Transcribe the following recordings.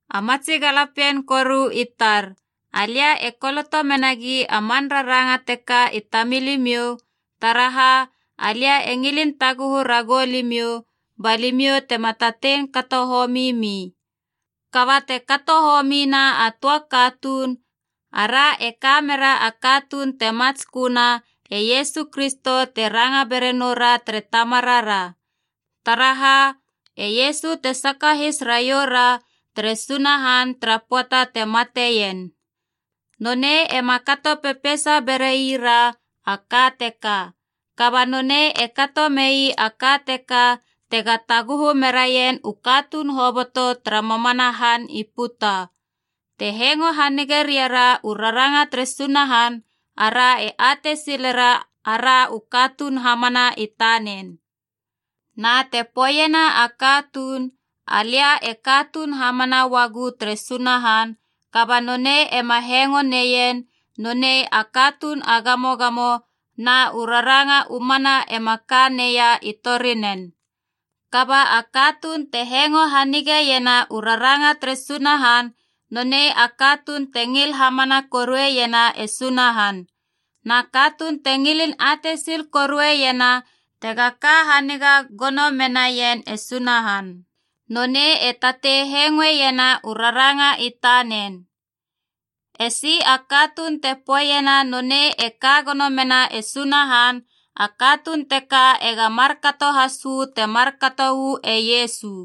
A matsi galapien koru i tar, alia e koloto menagi a man raranga teka i tamilimiou, taraha alia e ngilin taguhu ragou limiou ba limiou tema tatei kato homi mi. Kaba te kato homina a töa katuun, ara e kamera a katuun te matsköna, e Iesu Kristo te ranga bera noura tere Tamarara. Taraha, e Iesu te sakahis raioura tere Sunahan tara pöata te mateien. Nonei ema kato pepeisa beraira a ka teka. Kaba nonei e kato mei a ka teka tega taguhu meraien u katuun hoboto tara mamana han i puta. Te hengo hanige riara u raranga tere Sunahan, ara e atei silera ara u katuun hamana i tanen. Na te poeiena a katuun, “Alia e katuun hamana uagu tere Sunahan,” kaba nonei ema hengoe neien, nonei a katuun a gamogamo na u raranga u mana ema ka neia i torinen. Kaba a katuun te hengo hanigeiena u raranga tere Sunahan, nonei a katuun te ngil hamana korueiena e Sunahan. Na katuun te ngilin atei sil korueiena tega ka haniga gono menaien e Sunahan, nonei e tatei hengoena u raranga i tanen. Esi a katuun te poeiena nonei e ka gono mena e Sunahan, a katuun teka ega markato has uu te markato uu e Iesu.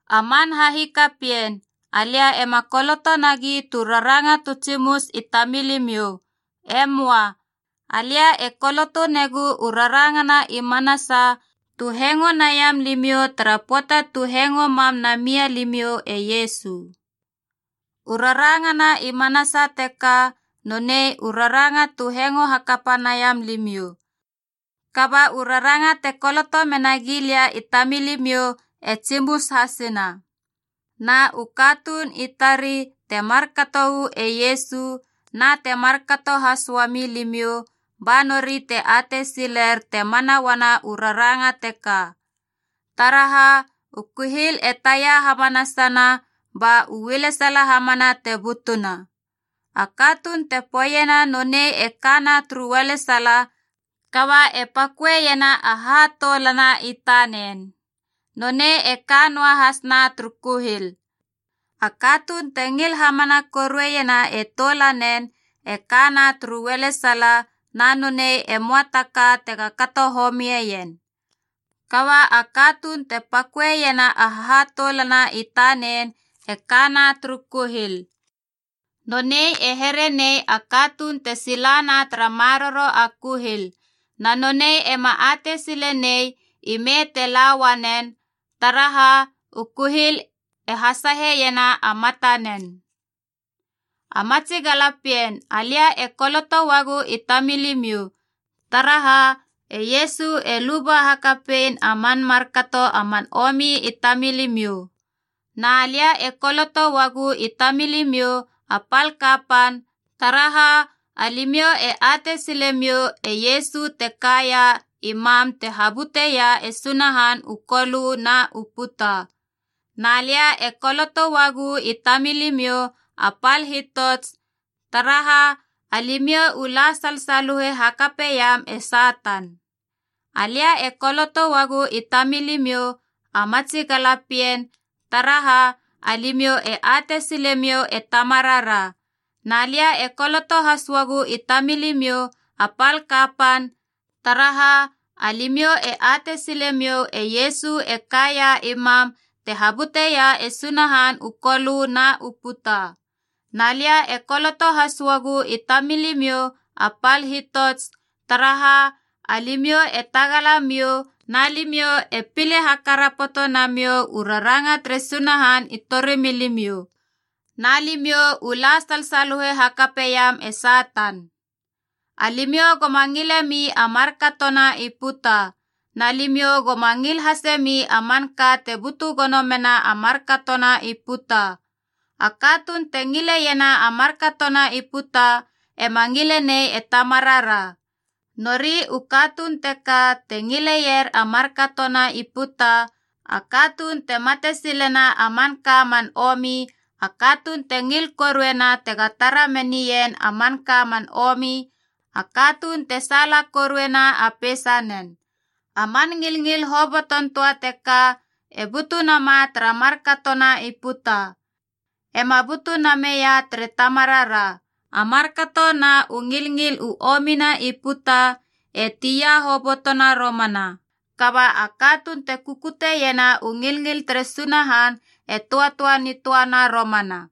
A man hahikapien, alia ema koloto nagi tu raranga tu tsimus i tamilimiou. E möa. Alia e koloto negu u rarangana i manasa tu hengo naiam limiou tara pöata tu hengo mam namia limiou e Iesu. U rarangana i manasa teka nonei u raranga tu hengo hakapa naiam limiou. Kaba u raranga te koloto mena gilia i tamilimiou e tsimus hasina. Na u katuun i tari te markato uu e Iesu na te markato has uami limiou ba nori te atei siler te mana uana u raranga teka. Taraha, u kuhil e tia hamanasana ba u ualesala hamana te butuna. A katuun te poeiena nonei e kana turu ualesala, kaba e paköeiena a hahatoulana i tanen, nonei e ka noa hasna turu kuhil. A katuun te ngil hamana korueiena e toulanen e kana turu ualesala, na nonei e möa ta ka tega kato homieien. Kaba a katuun te paköeiena a hahatoulana i tanen e kana turu kuhil. Nonei e here nei a katuun te silana tara maroro a kuhil. Na nonei ema atei sile nei ime te la uanen, taraha u kuhil e hasaheiena a matanen. A matsi galapien alia e koloto uagu i tamilimiou, taraha e Iesu e luba hakapein a man markato a man omi i tamilimiou. Na lia e koloto uagu i tamilimiou, a pal kapan, taraha alimiou e atei silemiou e Iesu te kaia i mam te habuteia e Sunahan u kolö na u puta. Na lia e koloto uagu i tamilimiou, a pal hitots, taraha alimiou u la salsaluhe hakapeiam e Satan. Alia e koloto uagu i tamilimiou, a matsi galapien, taraha alimiou e atei silemiou e Tamarara. Na lia e koloto has uagu i tamilimiou, a pal kapan, taraha alimiou e atei silemiou e Iesu e kaia i mam te habuteia e Sunahan u kolö na u puta. Na lia e koloto has uagu i tamilimiou, a pal hitots, taraha alimiou e tagala miou na limiou e pile hakarapoto namiou u raranga tere Sunahan i torimilimiou, na limiou u la salsaluhe hakapeiam e Satan. Alimiou goma ngilemi a markatona i puta. Na limiou goma ngil hasemi a manka te butu gono mena a markatona i puta. A katuun te ngileiena a markatona i puta ema ngile nei e Tamarara. Nori u katuun teka te ngileier a markatona i puta: a katuun te matesilena a manka man omi, a katuun te ngil korueiena tega tara menaien a manka man omi, a katuun te saala koruena a peisanen. A man ngilngil hoboton töa teka e butu nama tara markatona i puta. E ma butu nameia tere Tamarara. A markato na u ngilngil u omina i puta e tia hobotona romana, kaba a katuun te kukuteiena u ngilngil tere Sunahan e töatöa nitöana romana.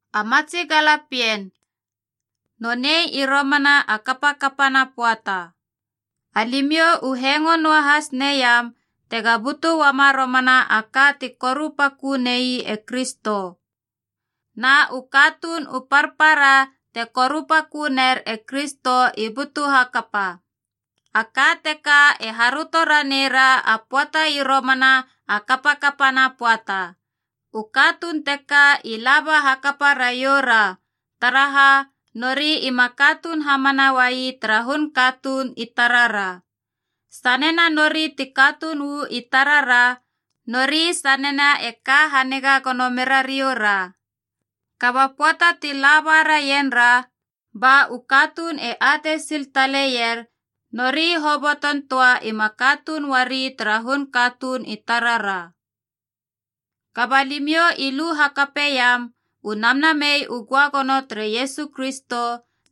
A matsi galapien, nonei i romana a kapakapana pöata. Alimiou u hengo noahas neiam tega butu uama romana a ka te korupaköni e Kristo. Na u katuun u parpara te korupakö ner e Kristo i butu hakapa. A ka teka e haröto raneira a pöata i romana a kapakapana pöata. U katuun teka i laba hakapa raioura, taraha nori ima katuun hamana uai tara hun katuun i tarara. Sanena nori ti katuun uu i tarara, nori sanena e ka haniga gono meraioura. Kaba pöata ti laba raienra, ba u katuun e atei sil taleier nori hoboton töa ema katuun uari tara hun katuun i tarara. Kaba limiou i lu hakapaneiam u Namnamei u Göagono tere Iesu Kristo,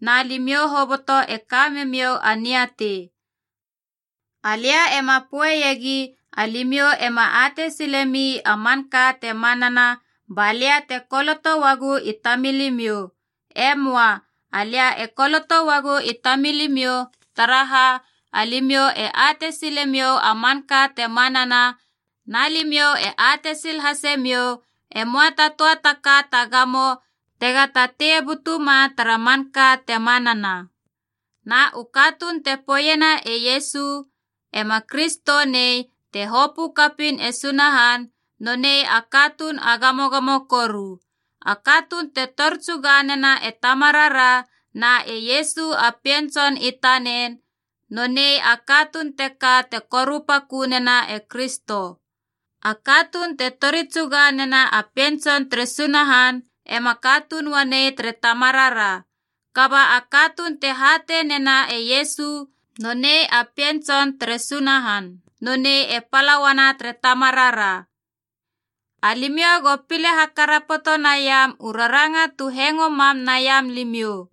na limiou hoboto e kame miou a niatei. Alia ema poeiegi alimiou ema atei silemi a manka te manana, ba lia te koloto uagu i tamilimiou. E möa. Alia e koloto uagu i tamilimiou taraha alimiou e atei silemiou a manka te manana, na limiou e atei sil hasemiou e möa ta töa ta ka ta gamo tega tatei butuma tara manka te manana. Na a katuun te poeiena e Iesu ema Kristo nei te hopö kapiin e Sunahan, nonei a katuun a gamogamo koru. A katuun te tori tsuga nena e Tamarara na e Iesu a Pien Tson i tanen, nonei a katuun teka te korupakö nena e Kristo. A katuun te tori tsuga nena a Pien Tson tere Sunahan ema katuun uanei tere Tamarara. Kaba a katuun te hatei nena e Iesu nonei a Pien Tson tere Sunahan, nonei e pala uana tere Tamarara. Alimiou go pile hakarapoto naiam u raranga tu hengo mam naiam limiou.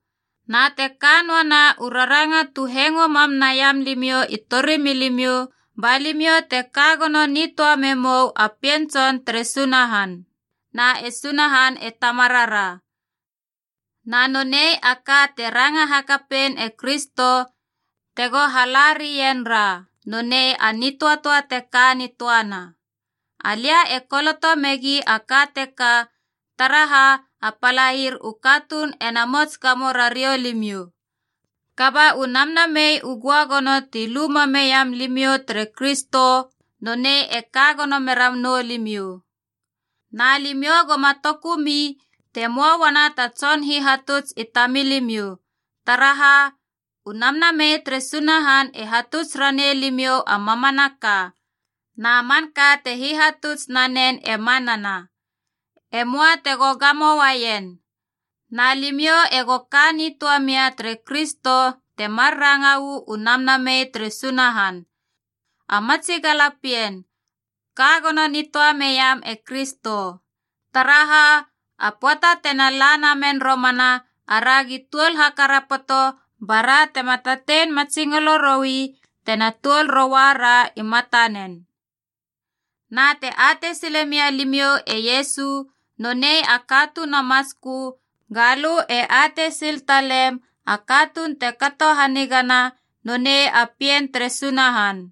Na te ka noana u raranga tu hengo mam naiam limiou i torimilimiou, ba limiou te ka gono nitöa memou a Pien Tson tere Sunahan, na e Sunahan e Tamarara. Na nonei a ka te ranga hakapein e Kristo, tego hala rien ra, nonei a nitöatöa te ka nitöana. Alia e koloto megi a ka teka, taraha a palair u katuun ena mots gamo rariou limiou. Kaba u Namnamei u Göagono ti lu mameiam limiou tere Kristo, nonei e ka gono mera noulimiou. Na limiou goma tokumi te möa uana ta tson hihatuts i tamilimiou. Taraha, u Namnamei tere Sunahan e hatuts ranei limiou a mamanaka. Na manka te hihatuts nanen e manana. E möa tego gamouaien. Na limiou ego ka nitöa mia tere Kristo temar ranga uu Namnamei tere Sunahan. A matsi galapien, ka gono nitöa meiam e Kristo. Taraha, a pöata tena la namen romana, aragi tuol hakarapoto bara tema tatei matsingolo roi tena tuol roua ra i matanen. Na te atei silemia limiou e Iesu nonei a katuun a matskö, ga lö e atei sil talem a katuun te kato hanigana nonei a pien tere Sunahan.